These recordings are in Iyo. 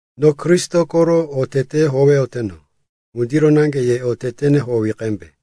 No Kristo koro oteteyó howeyoteno, ŋundiro naŋge ye otetene howi qembe.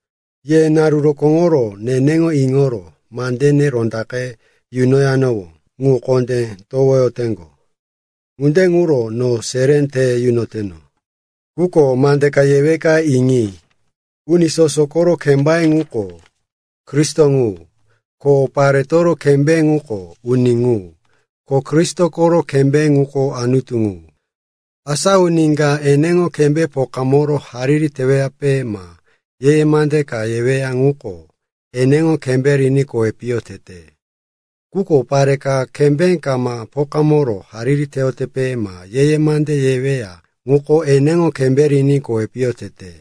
Ye naru rokóŋoro neneŋo iŋoro mande rondaqe yunanowó ŋu kondé towoyoteŋgo. Ŋunde ŋuro no seré te yunoteno. Quko mande ka yeweka iŋi. Uni soso koro kembaye ŋuko Kristo ŋu, ko paretoro kembé ŋuko uni ŋu, ko Kristo koro kembé ŋuko Anutu ŋu. Asa uni ka eneŋo kembé pokamoro hariri teweyape ma ye-ye mande ka yeweya ŋuko eneŋo kembé riní kowi piyo tete. Quko pare ka kembé kama pokamoro hariri teweyape ma ye-ye mande yeweya ŋuko eneŋo kembé riní kowi piyo tete.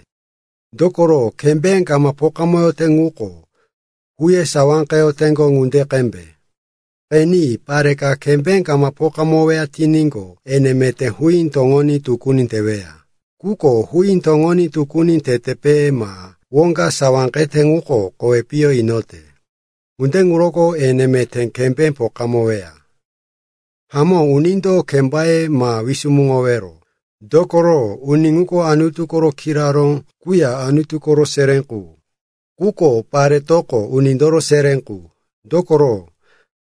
Dokoro kembé kama pokamoyote ŋuko huye sawáqeyoteŋgo ŋunde qembe. Qeni, pare ka kembé kama pokamoweya tiníqo, ene meté huí toŋoní tukuni teweya. Quko huí toŋoní tukuni tetepe ma woŋga sawáqete ŋuko kowi piyo inote. Ŋunde ŋuroko ene meté kembé pokamoweya. Hamó, unindo kembaye ma wisumuŋowero, dokoro uni ŋuko Anutu koro kiraró quya Anutu koro seré qu. Quko paretoko unindoro seré qu. Dokoro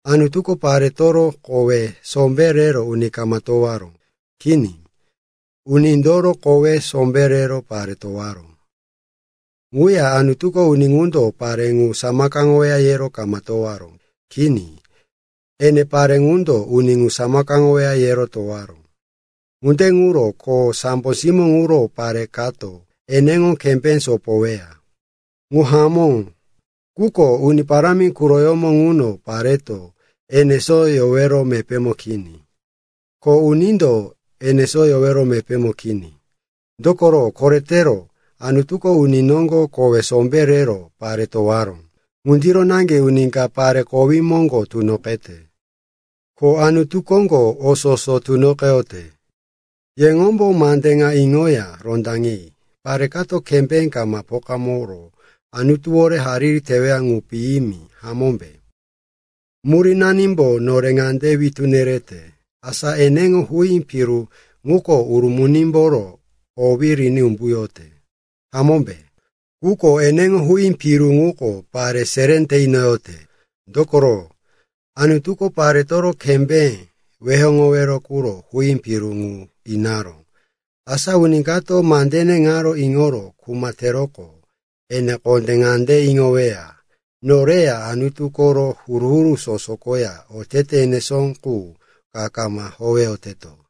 Anutuko paretoro kowe sombé rero uni kama towaró. Kini. Unindoro kowe sombé rero pare towaró. Ŋuya Anutuko uni ŋundo pare ŋu samakaŋoweya yero kama towaró. Kini. Ene pare ŋundo uni ŋu samakaŋoweya yero towaró. Ŋunde ŋuro, ko sambo simó ŋuro, pare kato eneŋo kembé sopoyoweya. Ŋu hamó, quko Uni Parámi quroyómo ŋuno pareto enesó yowero mepémo kini, ko unindo enesó yowero mepémo kini. Dokoro koretero Anutuko uni noŋgo kowe sombé rero pare towaró. Ŋundiro naŋge uni ka pare kowí moŋgo tunoqete. Ko Anutu koŋgo o soso tunoqeyote. Yeŋombo mande ŋa iŋoya rondaŋi. Pare kato kembé kama pokamoro Anutuwore hariri teweya ŋu piyimi, hamómbe? Murínanimbo nore ŋande witú yerete, asa eneŋo huí piru ŋuko urumunimboro owí riní umbuyote, hamómbe? Quko eneŋo huí piru ŋuko pare seré te inoyote. Dokoro, Anutuko paretoro kembé weyoŋowero quro huí piru qu inaró. Asa uni kato mandene ŋaro kiro kuma teroqo, ene kondé ŋande iŋoweya, noreya Anutu koro huru-huru soso koya otete enesó qu ka kama howeyoteto.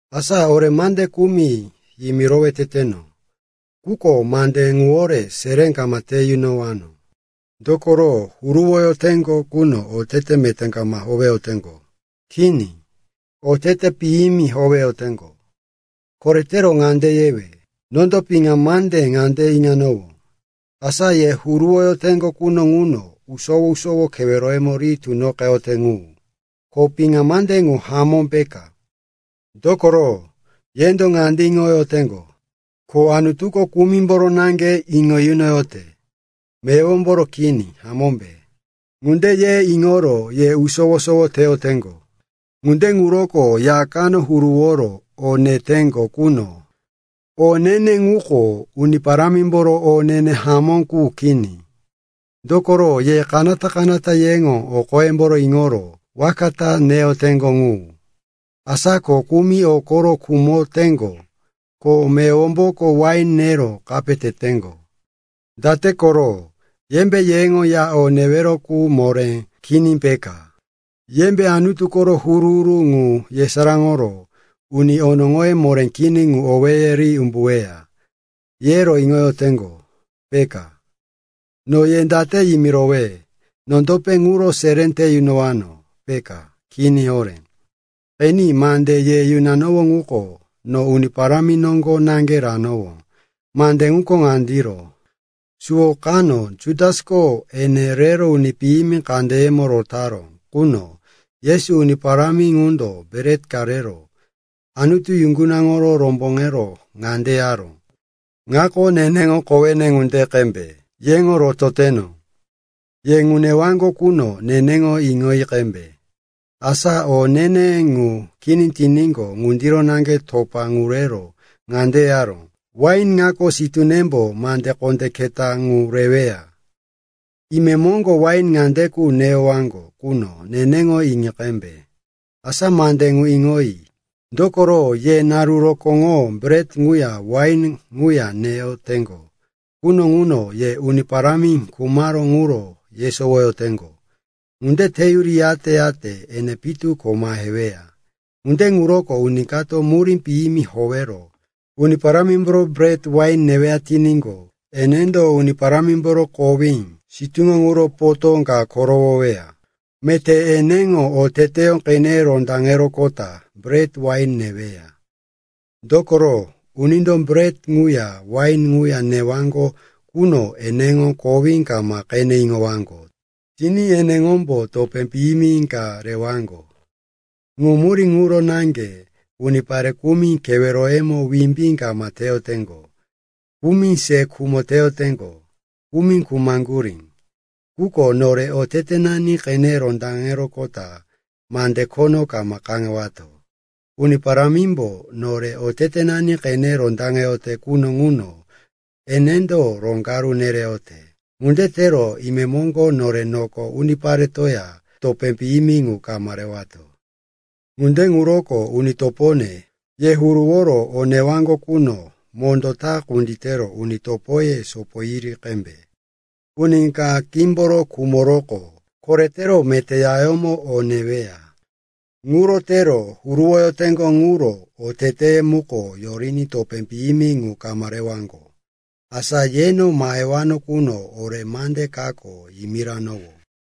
Asa ore mande kumi yimirowe teteno, quko mande ŋuwore seré kama te yunowano. Dokoro huruwoyoteŋgo quno otete meté kama howeyoteŋgo. Kini, otete piyimi howeyoteŋgo. Koretero ŋande yewe: nondo piŋa mande ŋande iŋanowó, asa ye huruwoyoteŋgo quno ŋuno usowo-sowo keweroyemo ri tunoqeyote ŋu. Ko piŋa mande ŋu hamó peka. Dokoro, yendo ŋande ye iŋoyoteŋgo, ko Anutuko kumimboro naŋge iŋo yunoyote, meyowomboro kini, hamómbe? Ŋunde ye iŋoro ye usowo-sowo teyoteŋgo. Ŋunde ŋuroko ya kano huruworo o neteŋgo quno, o ne-ne ŋuko Uni Parámimboro o ne-ne hamó qu kini. Dokoro ye kanata-kanata yeŋo o qoyemboro iŋoro waka ta neyoteŋgo ŋu. Asa ko kumi o koro khumoteŋgo ko meyowomboko wain nero kape teteŋgo. Date koro? Yembe yeŋo ya o newero qu moré kini peka? Yembe Anutu koro huru-huru ŋu yesaráŋoro uni onoŋoye moré kini ŋu owéye ri umbuweya, yero iŋoyoteŋgo, peka? No ye date yimirowe? Nondope ŋuro seré te yunowano, peka? Kini horé! Qeni, mande ye yunanowó ŋuko, no Uni Parámi noŋgo naŋge ranowó. Mande ŋuko ŋandiro. Suwo kano Jutasko ene rero uni piyimi kandeyemo rotaró quno, Yesu, Uni Parámi ŋundo, bret ka rero Anutu yuŋgunaŋoro romboŋero ŋande yaró, “Ŋako neneŋo kowene ŋunde qembe, yeŋo rototeno. Ye ŋu neyowaŋgo quno, neneŋo iŋoyi qembe.” Asa o ne-ne ŋu kini tiníqo, ŋundiro naŋge topa ŋu rero ŋande yaró, “Wain ŋako sitúnembo mande kondé keta ŋu reweya. Imemoŋgo wain ŋande qu neyowaŋgo quno, neneŋo iŋi qembe.” Asa mande ŋu iŋoyi, dokoro ye naru rokóŋo bret ŋuya wain ŋuya neyoteŋgo quno ŋuno, ye Uni Parámi khumaró ŋuro yesowoyoteŋgo. Ŋunde teyuri, yate-yate ene pitu ko maheweya. Ŋunde ŋuroko uni kato murí piyimi howero Uni Parámimboro bret, wain neweya tiníqo, enendo Uni Parámimboro kowí, sitúŋo ŋuro potó ka korowoweya. Meté eneŋo oteteyó qene rondaŋeroqota bret, wain neweya. Dokoro, unindo bret ŋuya wain ŋuya newaŋgo quno eneŋo kowí kama qene iŋowaŋgo tiní eneŋombo topé piyimi ka rewaŋgo. Ŋu murí ŋuro naŋge unipare kumi keweroyemo wimbí kama teyoteŋgo, kumi se khumo teyoteŋgo, kumi khumaŋgurí. Quko nore otetenani qene rondaŋeroqota mande khono kama kaŋewato. Uni Parámimbo nore otetenani qene rondaŋeyote quno ŋuno enendo roŋgaru nereyote. Ŋunde tero imemoŋgo nore noko uniparetoya topé piyimi ŋu kama rewato. Ŋunde ŋuroko, uni topone, ye huruworo o newaŋgo quno mondó ta kunditero uni topoye sopoyuri qembe. Uni ka qímboro khumoroqo, koretero meté yayómo o neweya. Ŋuro tero huruwoyoteŋgo ŋuro oteteye muko yoriní topé piyimi ŋu kama rewaŋgo. Asa yeno mahewano quno ore mande kako yimirowano.